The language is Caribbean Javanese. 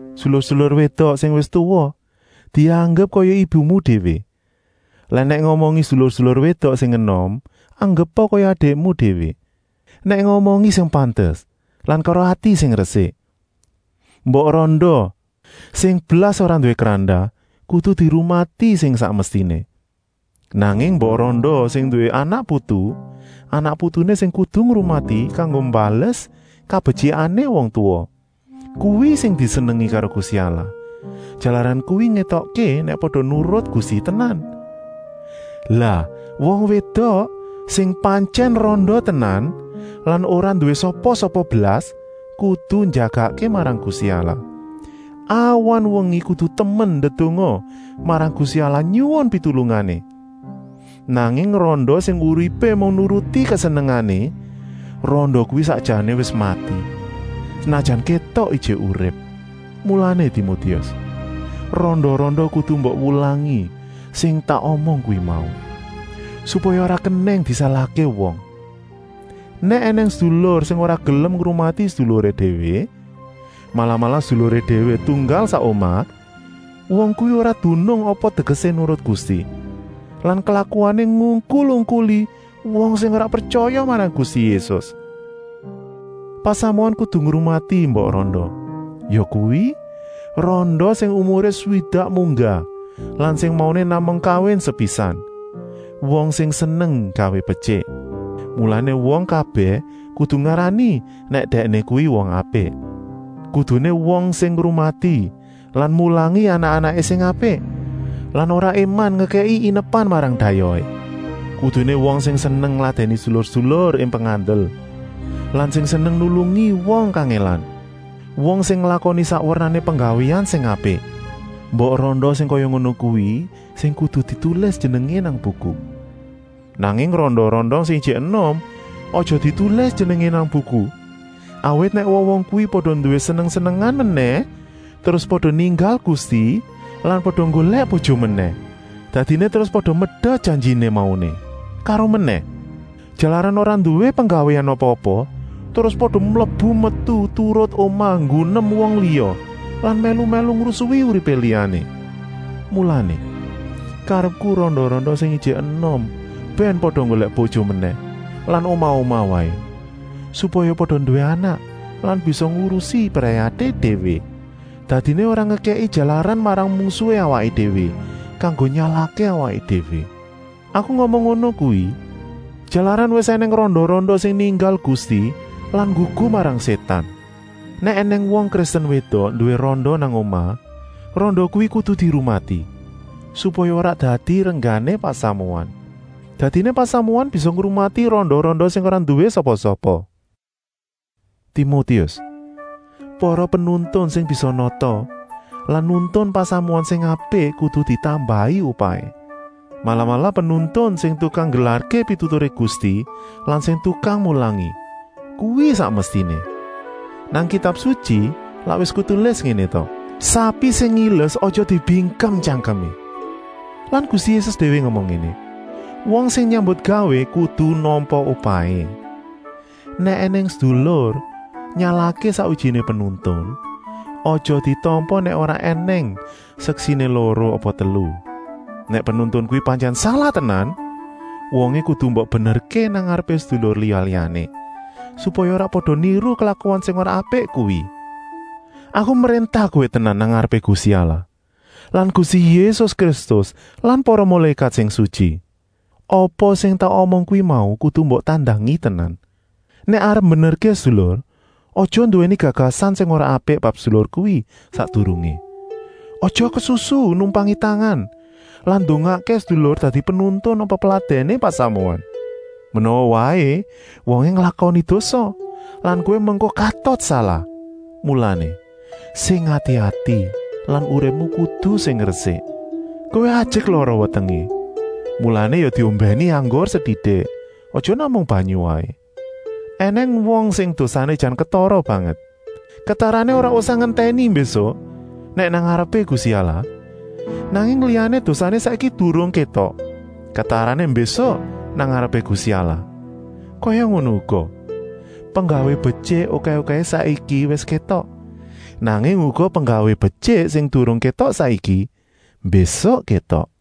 Sedulur-sedulur wédok sing wis tuwa dianggep kaya ibumu déwé lan nèk ngomongi sedulur-sedulur wédok sing enom anggepa kaya adikmu déwé. Nèk ngomongi sing pantes lan karo ati sing resik. Mbok randa sing blas ora nduwé krandah kudu dirumati sing sak mestiné. Nanging mbok randa sing nduwé anak-putu, anak-putuné sing kudu ngrumati kanggo mbales kabetyikané wong tuwa. Kuwi sing disenengi karo Gusti Allah, jalaran kuwi ngétokké nèk pada nurut Gusti tenan. Lah wong wédok sing pantyèn randa tenan lan ora nduwé sapa-sapa blas kudu njagakké marang Gusti Allah. Awan-wengi kudu temen ndedonga marang Gusti Allah nyuwun pitulungané. Nanging randa sing uripé mung nuruti kesenengané, randa kuwi sakjané wis mati, senajan kétok ijik urip. Mulané Timotius, randa-randa kudu mbok wulangi sing tak omong kuwi mau, supaya ora kenèng disalahké wong. Nèk ènèng sedulur sing ora gelem ngrumati seduluré déwé, malah-malah seduluré déwé tunggal sak omah, wong kuwi ora dunung apa tegesé nurut Gusti lan klakuané ngungkul-ungkuli wong sing ora pretyaya marang Gusti Yésus. Pasamuan kudu ngrumati mbok randa, yakuwi, randa sing umuré swidak munggah lan sing mauné namung kawin sepisan, wong sing seneng nggawé betyik. Mulané wong kabèh kudu ngarani nèk dèkné kuwi wong apik. Kuduné wong sing ngrumati lan mulangi anak-anaké sing apik lan ora éman ngekèki inepan marang dayohé. Kuduné wong sing seneng ngladèni sedulur-sedulur ing pengandel lan sing seneng nulungi wong kangèlan, wong sing nglakoni sak wernané penggawéan sing apik. Mbok randa sing kaya ngono kuwi sing kudu ditulis jenengé nang buku. Nanging randa-randa sing ijik enom aja ditulis jenengé nang buku, awit nèk wong-wong kuwi pada nduwé seneng-senengan menèh terus pada ninggal Gusti lan pada nggolèk bojo menèh. Dadiné terus pada medot janjiné mauné. Karomenèh, jalaran ora nduwé penggawéan apa-apa, terus pada mlebu-metu turut omah nggunem wong liya lan mèlu-mèlu ngrusui uripé liyané. Mulané, karepku randa-randa sing ijik enom bèn pada nggolèk bojo menèh lan omah-omah waé, supaya pada nduwé anak lan bisa ngurusi brayaté déwé. Dadiné ora ngekèki jalaran marang mungsuhé awaké déwé kanggo nyalahké awaké déwé. Aku ngomong ngono kuwi, jalaran wis ènèng randa-randa sing ninggal Gusti lan nggugu marang Sétan. Nèk ènèng wong Kristen wédok nduwé randa nang omah, randa kuwi kudu dirumati, supaya ora dadi renggané pasamuan. Dadiné pasamuan bisa ngrumati randa-randa sing ora nduwé sapa-sapa. Timotius, para penuntun sing bisa nata lan nuntun pasamuan sing apik kudu ditambahi upahé, malah-malah penuntun sing tukang nggelarké pituturé Gusti lan sing tukang mulangi. Kuwi sak mestiné. Nang Kitab Sutyi lak wis ketulis ngéné ta: “Sapi sing ngiles aja dibingkem tyangkemé.” Lan Gusti Yésus déwé ngomong ngéné: “Wong sing nyambutgawé kudu nampa upahé.” Nèk ènèng sedulur nyalahké sakwijiné penuntun, aja ditampa nèk ora ènèng seksiné loro apa telu. Nèk penuntun kuwi pantyèn salah tenan, wongé kudu mbok benerké nang ngarepé sedulur liya-liyané, supaya ora pada niru klakuan sing ora apik kuwi. Aku mréntah kowé tenan nang ngarepé Gusti Allah lan Gusti Yésus Kristus lan para mulékat sing sutyi: apa sing tak omong kuwi mau kudu mbok tandangi tenan. Nèk arep mbenerké sedulur, aja nduwèni gagasan sing ora apik bab sedulur kuwi sakdurungé. Aja kesusu numpangi tangan lan ndongakké sedulur dadi penuntun apa peladèné pasamuan. Menawa waé wongé nglakoni dosa lan kowé mengko katut salah. Mulané, sing ati-ati lan uripmu kudu sing resik. Kowé ajek lara wetengé, mulané ya diombèni anggur setitik, aja namung banyu waé. Enèng wong sing dosané jan ketara banget, ketarané ora usah ngentèni mbésuk, nèk nang ngarepé Gusti Allah. Nanging liyané dosané saiki durung kétok, ketarané mbésuk nang ngarepé Gusti Allah. Kaya ngono uga, penggawé betyik okèh-okèhé saiki wis kétok. Nanging uga penggawé betyik sing durung kétok saiki, mbésuk kétok.